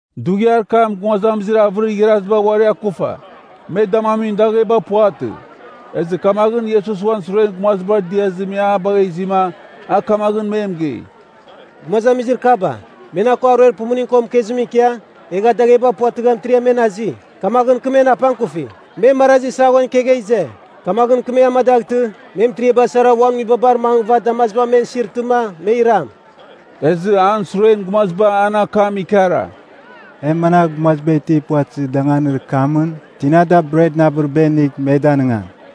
Dughiar kam gumazamizir avɨrir igharaziba uari akufa. Me damamin dagheba puvatɨ. Ezɨ kamaghɨn Iesus uan suren gumazibar diazɨ me a bagha izima a kamaghɨn me mɨgei, “Gumazamizir kaba, me na ko aruer pumuning ko mɨkezimɨn ikia, egha dagheba puvatɨgha mɨtiriam men azi, kamaghɨn kɨ men apangkufi. Me marazi saghon kegha ize. Kamaghɨn kɨ me amadaghtɨ, me mɨtiriaba sara, uan nguibabar mangɨva damaziba men isirtɨma me iram.” Ezɨ an suren gumaziba an akam ikara, “E managh gumaziba itir puvatɨzir danganir kamɨn tina bretɨn avɨriba inigh me danɨngam?”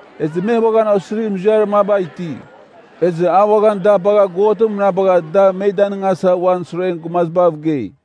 Ezɨ me uaghan osirir muziarir maba iti. Ezɨ a uaghan da bagha God mɨnabagha da me danɨngasa uan suren gumazibav gei.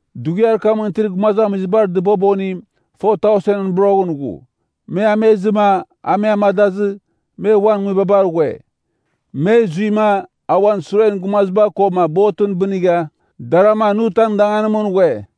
Dughiar kamɨn itir gumazamizibar dɨbobonim 4,000ɨn boroghɨn ghu. Me amezɨma, a me amadazɨ, me uan nguibabar ghue. Me zuima, a uan suren gumaziba koma botɨn bɨnigha, Daramanutan danganimɨn ghue.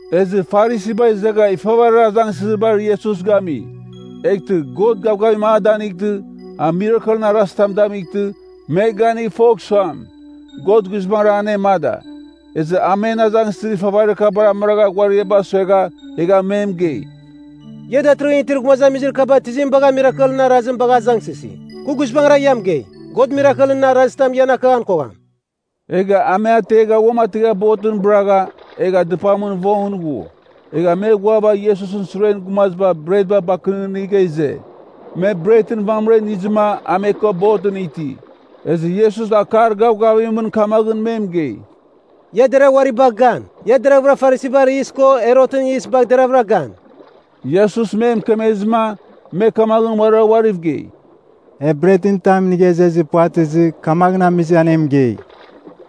Ezɨ Farisiba izegha ifavarir azangsɨzibar Iesus gami. Eghtɨ, God gavgavim a danightɨ, a mirakelɨn arazitam damightɨ, me ganigh fogh suam, God guizbangɨra anemada. Ezɨ a men azangsɨzir ifavaribar amɨragha ghuariaba suegha, egha me mɨgei, “Ia datɨrɨghɨn itir gumazamizir kaba tizim bagha mirakelɨn arazim bagha nan azangsɨsi? Kɨ guizbangɨra ia mɨgei, God mirakelɨn arazitam ian akaghan kogham.” Egha a me ategha uamategha botɨn bɨragha, egha dɨpamɨn vongɨn ghu. Egha me ghuava Iesusɨn suren gumaziba bretba bakɨnɨghɨnigha ize. Me bretɨn vamɨra inizɨma a me ko botɨn iti. Ezɨ Iesus akar gavgavimɨn kamaghɨn me mɨgei, “Ia deragh uari bagh gan! Ia deravɨra Farisibar yis ko Herotɨn yis bagh deravɨra gan.” Iesus me mɨkemezɨma, me kamaghɨn uarira uariv gei, “E bret tam inigha izezir puvatɨzɨ, kamaghɨn amizɨma an e mɨgei.”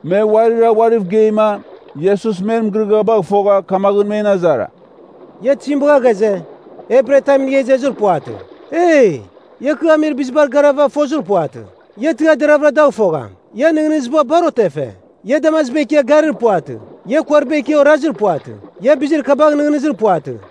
Me uarira uariv geima, Iesus men mɨgɨrɨgɨabagh fogha kamaghɨn men azara, “Ia tizim bagha ghaze, e bret tam inigha izezir puvatɨ? Eee, ia kɨ amir bizibar garava, fozir puvatɨ. Ia tɨghar deraghvɨra dagh fofogham? Ian nɨghnɨziba bar otefe. Ia damaziba ikia, garir puvatɨ? Ia kuariba ikia, orazir puvatɨ? Ia bizir kabagh nɨghnɨzir puvatɨ?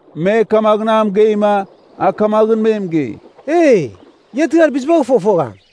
Me kamaghɨn a mɨgeima, a kamaghɨn me mɨgei, “Eee, ia tɨghar bizibagh fofogham.”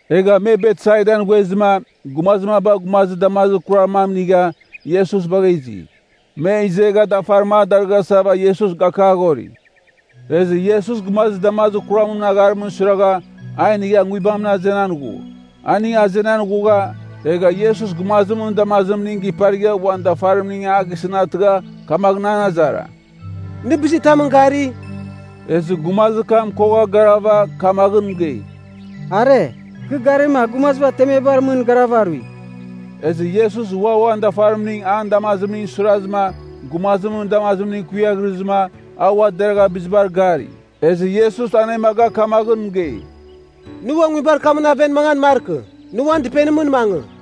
Egha me Betsaidan ghuezɨma, gumazir maba gumazir damazir kurar mam inigha, Iesus bagha izi. Me izegha dafarim a darɨghasava Iesus gakaghori. Ezɨ Iesus gumazir damazir kuramɨn agharimɨn suiragha, a inigha nguibam ategha azenan ghu. Aning azenan ghugha, egha Iesus gumazimɨn damazimning giparigha uan dafarimning a gisɨn atɨgha kamaghɨn an azara, “Nɨ bizitamɨn gari?” Ezɨ gumazir kam kogha garava kamaghɨn mɨgei, “Are, kɨ garima, gumaziba temebar mɨn garav arui.” Ezɨ Iesus ua uan dafarimning an damazimningɨn suirazɨma, gumazimɨn damazimning kuiaghrɨzɨma, a ua deragha bizibar gari. Ezɨ Iesus anemaga kamaghɨn mɨgei, “Nɨ ua nguibar kamɨn aven mangan markɨ. Nɨ uan dɨpenimɨn mangɨ.”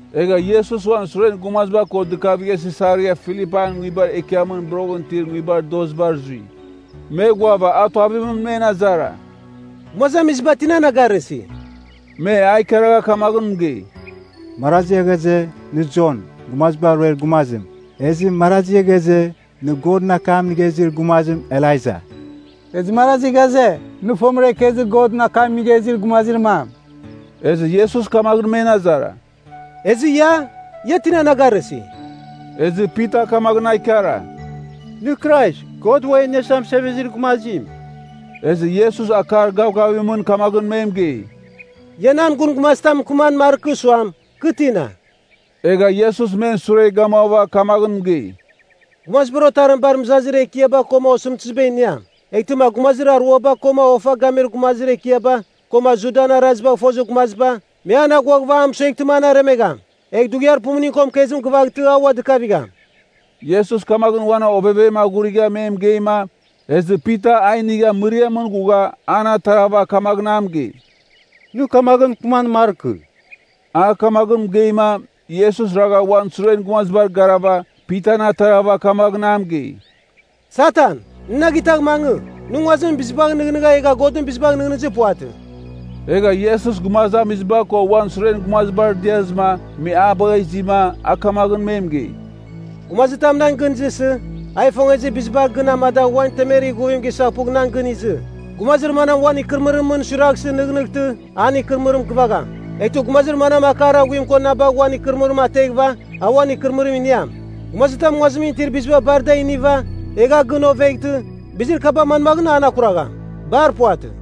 Egha Iesus uan suren gumaziba ko dɨkavigha Sisaria Filipain nguibar ekiamɨn boroghɨn itir nguibar dozibar zui. Me ghuava a tuavimɨn men azara, “Gumazamiziba tina na garɨsi?” Me a ikaragha kamaghɨn mɨgei, “Marazi ghaze, nɨ Jon, Gumaziba Ruer Gumazim. Ezɨ marazi ghaze, nɨ Godɨn akam inigha izir gumazim Elaija. Ezɨ marazi ghaze, nɨ fomɨra ikezir Godɨn akam inigha izir gumazir mam.” Ezɨ Iesus kamaghɨn men azara, “Ezɨ ia? Ia tina na garɨsi?” Ezɨ Pita kamaghɨn a ikara, “Nɨ Krais, God Ua e Iniasa Mɨsevezir Gumazim.” Ezɨ Iesus akar gavgavimɨn kamaghɨn me mɨgei, “Ia nan gun gumazitam mɨkɨman markɨ suam, kɨ tina.” Egha Iesus men sure gamuava kamaghɨn mɨgei, “Gumazibar Otarim bar mɨzazir ekiaba koma osɨmtɨziba iniam. Eghtɨma gumazir aruaba, koma ofa gamir gumazir ekiaba, koma Judan arazibagh fozir gumaziba, me an aghuaghɨva a mɨsueghtɨma an aremegham. Egh dughiar pumuning ko mɨkezim gɨvaghtɨ a ua dɨkavigham.” Iesus kamaghɨn uan ovevem aghurigha me mɨgeima, ezɨ Pita a inigha mɨriamɨn ghugha, an atarava kamaghɨn a mɨgei, “Nɨ kamaghɨn mɨkɨman markɨ.” A kamaghɨn mɨgeima, Iesus ragha uan suren gumazibar garava, Pitan atarava kamaghɨn a mɨgei, “Satan, nɨ na gitagh mangɨ! Nɨ nguazimɨn bizibagh nɨghnɨgha egha Godɨn bizibagh nɨghnɨzir puvatɨ.” Egha Iesus gumazamiziba ko uan suren gumazibar, diazɨma, me a bagha izima, a kamaghɨn me mɨgei, “Gumazitam nan gɨn izɨsɨ, a ifongezir biziba gɨn amadagh uan temer ighuvim gisaghpugh nan gɨn izɨ. Gumazir manam uan ikɨrɨmɨrimɨn suiraghsɨ nɨghnɨghtɨ, an ikɨrɨmɨrim gɨvagham. Eghtɨ gumazir manam akar aghuim ko na bagh uan ikɨrɨmɨrim ateghɨva, a uan ikɨrɨmɨrim iniam. Gumazitam nguazimɨn itir biziba bar da iniva, egh a gɨn oveghtɨ, bizir kaba manmaghɨn an akuragham? Bar puvatɨ.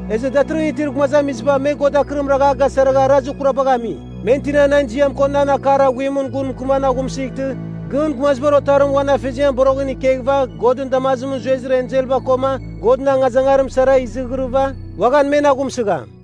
Ezɨ datɨrɨghɨn itir gumazamiziba me God akɨrim ragha a gasaragha arazir kurabagh ami. Men tina nan ziam ko nan akar aghuimɨn gun mɨkɨman aghumsɨghtɨ gɨn Gumazibar Otarim uan afeziamɨn boroghɨn ikeghɨva Godɨn damazimɨn zuezir enselba koma Godɨn angazangarim sara izighirɨva, uaghan men aghumsɨgham.”